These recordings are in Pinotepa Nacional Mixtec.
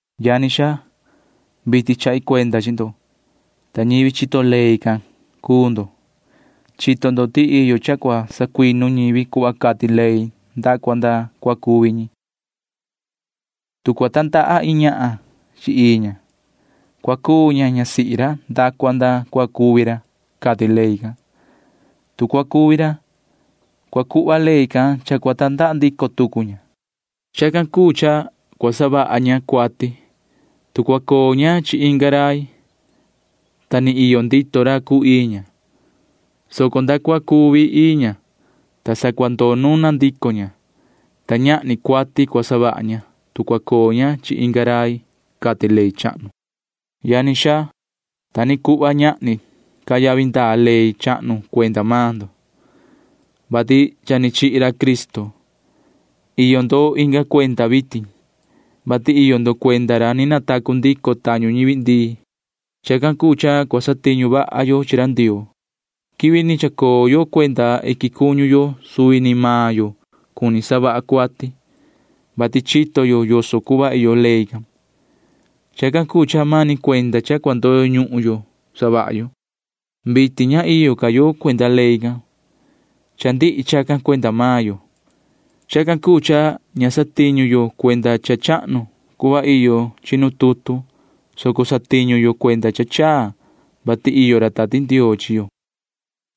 Yani xaa, vitin chahi cuenda chi ndo, ta ñivi chito ley can cuu ndo. Chito ndo ti iyo cha cua sacuinu ñivi cuhva cati ley nda cua nda cua cuvi ñi. Tu cua tandaha iin ñahan chi ii ña, cua cuu ña ñasihi ra nda cua nda cua cuvi ra, cati ley can. Tu cua cuvi ra, cua cuhva ley can cha cua tandaha ndico tucu ña. Chacan cuu cha cua savaha ña cuati, tu cua coo ña chi inga rai, ta ni iyo ndito ra cuu ii ña, soco nda cua cuvi ii ña, ta sa cua ndoo nuna ndico ña, ta ñahni cuati cua savaha ña, tu cua coo ña chi inga rai, cati ley chahnu. Yani xaa, ta ni cuhva ñahni ca yavi ndaa ley chahnu cuenda maan ndo, vati cha ni chihi ra Cristo. Iyo ndo inga cuenda vitin, vati iyo ndo cuenda ra ni natacu ndico tañu ñivi ndii. Chacan cuu cha cua satiñu vaha yo chi ra Ndioo. Nu ni chacoo yo cuenda suvi ni maan yo cuni yo savaha yo cuati, vati chito yo yoso cuhva iyo ley can. Chacan cuu cha mani cuenda cha cua ndoyo ñuhun yo savaha yo. Vitin ña iyo ca yo cuenda ley can. Cha ndihi chacan cuenda maan yo. Chacan cuu cha ña satiñu yo cuenda cha chahnu cuhva iyo chi nu tutu, soco satiñu yo cuenda cha chaa, vati iyo ra Tati Ndioo chi yo.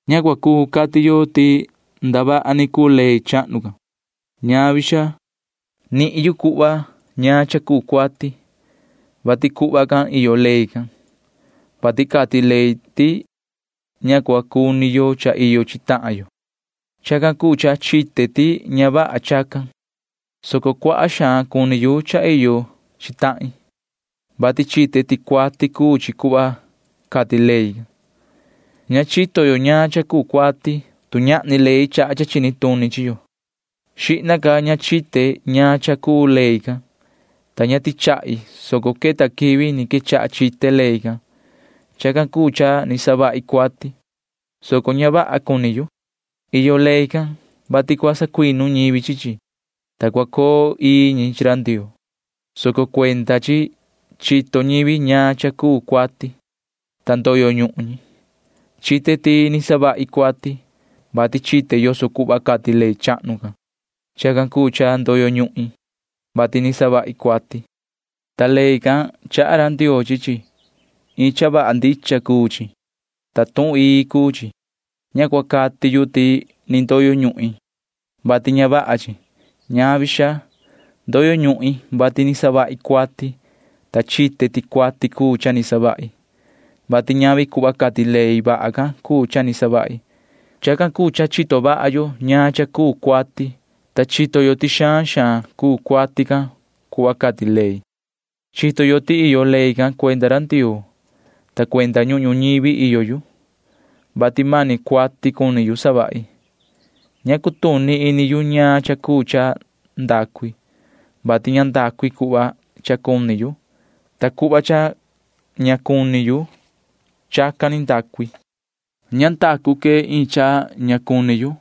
Ña cuu cati yo ti ndavaha ni cuu ley chahnu can. Ñavi, xaa. Nihin yu cuhva ñaan cha cuu cuati, vati cuhva can iyo ley can, vati cati ley ti ña cua cuni yo cha iyo chi tahan yo. Chacan cuu cha chite ti ña vaha chacan, soco cuaha xaan cuni yu cha iyo chi tahin, vati chite ti cuati cuu chi cuhva cati ley can. Ña chito yo ñaan cha cuu cuati, tu ñahni ley chaha cha chini tuni chi yo. Xihna ca ña chite ñaan cha cuu ley can, ta ña tichahi, soco queta quivi ni quechaha chite ley can. Chacan cuu cha ni savahi cuati, soco ña vaha cuni yu. Iyo ley can, vati cua sacuinu ñivi chi chi, ta cua coo ii ñi chi ra Ndioo, soco cuenda chi chito ñivi ñaan cha cuu cuati, ta ndoyo ñuhun ñi. Chite ti ni savahi cuati, vati chite yoso cuhva cati ley chahnu can. Chacan cuu cha ndoyo ñuhin, vati ni savahi cuati. Ta ley can―chaha ra Ndioo chi chi. Iin cha vaha ndicha cuu chi, ta tuhun ii cuu chi. Ña cua cati yu ti ni ndoyo ñuhin, vati ña vaha chi. Ñavi, xaa. Ndoyo ñuhin, vati ni savahi cuati, ta chite ti cuati cuu cha ni savahi, vati ñavi cuhva cati ley vaha can cuu cha ni savahi. Chacan cuu cha chito vaha yo ñaan cha cuu cuati, ta chito yo ti xaan xaan cuu cuati can cuhva cati ley. Chito yo ti iyo ley can cuenda ra Ndioo, ta cuenda ñuhun ñuñivi iyo yu, vati mani cuati cuni yu savahi. Ña cutuni ini yu ñaan cha cuu cha ndacu i, vati ña ndacu i cuhva cha cuni yu, ta cuhva cha ña vaha cuni yu―chacan ni ndacu i. Nu ni savahi cuhva cha ña cuni yu,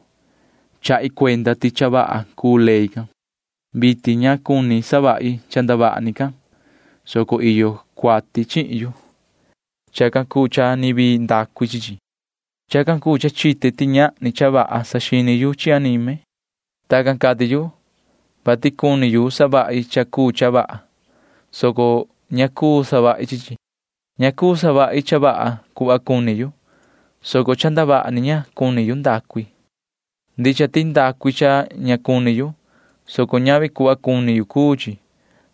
chahi cuenda ti cha vaha cuu ley can. Vitin ña cuni savahi cha ndavaha ni can, soco iyo cuati chihin yu. Chacan cuu cha ni vii ndacu i chi chi. Chacan cuu cha chite ti ñahni cha vaha saxini yu chi anime. Tacan cati yu, vati cuni yu savahi cha cuu cha vaha, soco ña cuu savahi chi chi. Ña cuu savahi cha vaha cuhva cuni yu, soco ndacu ni yu cha ndavaha ni, ta ña cuni yu chacan. Ndicha ti ndacu i cha ña cuni yu, soco ñavi cuhva cuni yu cuu chi.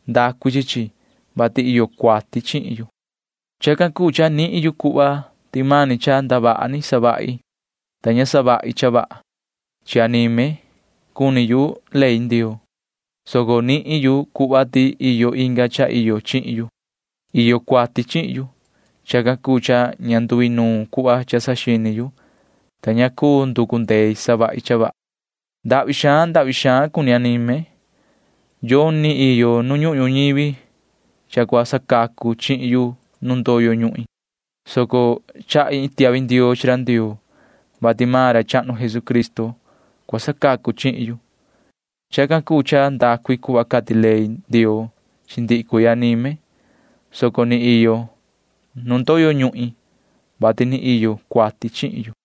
Ndacu i chi chi, vati iyo cuati chihin yu. Chacan cuu cha nihin yu cuhva ti mani cha ndavaha ni savahi nu ni cuni yu savahi cha vaha. Chi anime cuni yu ley Ndioo, soco nihin yu cuhva ti iyo inga cha iyo chihin yu. Iyo cuati chihin yu. Chacan cuu cha ña nduinuun cuhva cha saxini yu, ta ni ña cundee savahi cha vaha. Ndahvi xaan ndahvi xaan cuni anime. Yoni iyo nu ñuhun ñuñivi cha cua sacacu chihin yu nu ndoyo ñuhin, soco chahi iin tiahvi ndioo chi ra Ndioo, vati maan ra chahnu Jesucristo cua sacacu chihin yu. Chacan cuu cha ndacu i cuhva cati ley Ndioo chi ndihi cuii anime, soco ni iyo nu ndoyo ñuhin, vati ni iyo cuati chihin yu.